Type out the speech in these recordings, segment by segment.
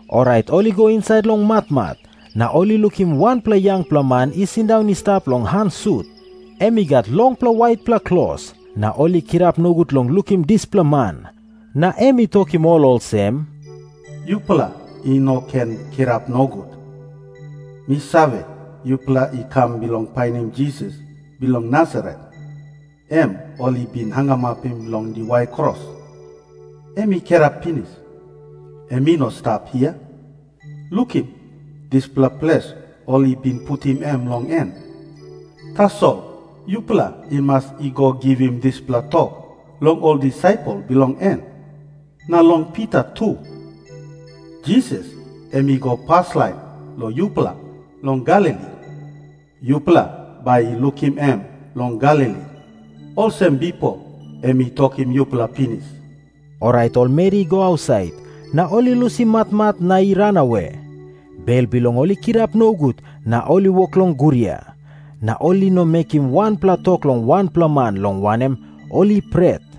Orait ol i go insait long matmat, na ol i lukim wanpela yangpela man i sindaun i stap long han sut. Em i gat longpela waitpela klos. Na ol i kirap nogut long lukim dispela man. Na em i tokim ol olsem, “Yupela i no ken kirap nogut. Mi save, yupela i kam bilong painim Jisas bilong Nasaret, em ol i bin hangamapim long diwai kros. Em i kirap pinis. Em i no i stap hia. Lukim dispela ples ol i bin putim em long en. Tasol yupela i mas i go givim dispela tok long ol disaipel bilong en, na long Pita tu, ‘Jisas em i go paslain long yupela long Galili. Yupela bai i lukim em long Galili, olsem bipo em i tokim yupela pinis.’” Orait ol meri i go ausait, na ol i lusim matmat na i ranawe. Bel bilong ol i kirap nogut na ol i wok long guria. Na ol i no mekim wanpela tok long wanpela man, long wanem, ol i pret.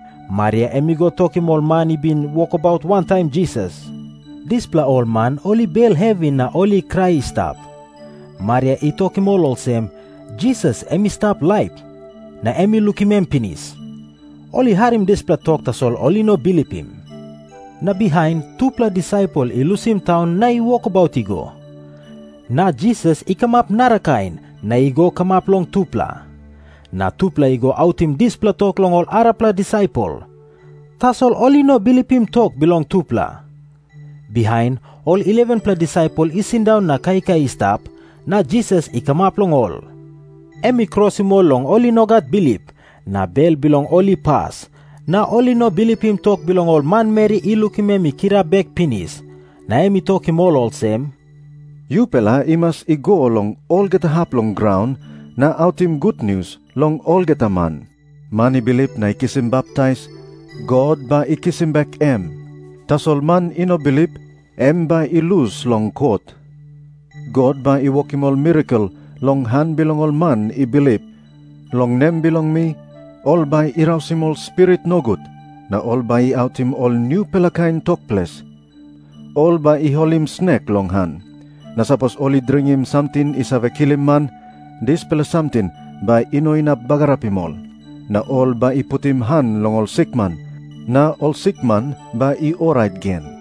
Maria em i go tokim ol man i bin wokabaut wantaim Jisas. Dispela ol man ol i bel hevi na ol i krai i stap. Maria i tokim ol olsem, “Jisas em i stap laip na mi lukim em pinis.” Ol i harim dispela tok, tasol ol i no bilipim. Na bihain tupela disaipel i lusim taun na i wokabaut i go. Na Jisas i kamap narakain na i go kamap long tupela. Na tupela i go autim dispela tok long ol arapela disaipel. Tasol ol i no bilipim tok bilong tupela. Bihain ol 11-pela disaipel i sindaun na kaikai i stap, na Jisas i kamap long ol. Em i krosim ol long ol i no gat bilip, na bel bilong ol i pas, na ol i no bilipim tok bilong ol manmeri i lukim em i kirap bek pinis. Na em i tokim ol olsem, “Yupela i mas i go long olgeta hap bilong graun na autim gutnius long olgeta man. Man i bilip na i kisim baptais, God bai i kisim bek em. Tasol man i no bilip, em bai i lus long kot. God bai i wokim ol mirakel long han bilong ol man i bilip. Long nem bilong mi ol bai i rausim ol spirit nogut, na ol bai i autim ol nupela kain tok ples. Ol bai i holim snek long han. Na sapos ol i dringim samting i save kilim man, dispela samting bai i no inap bagarapim ol. Na ol bai i putim han long ol sikman, na ol sikman bai i orait gen.”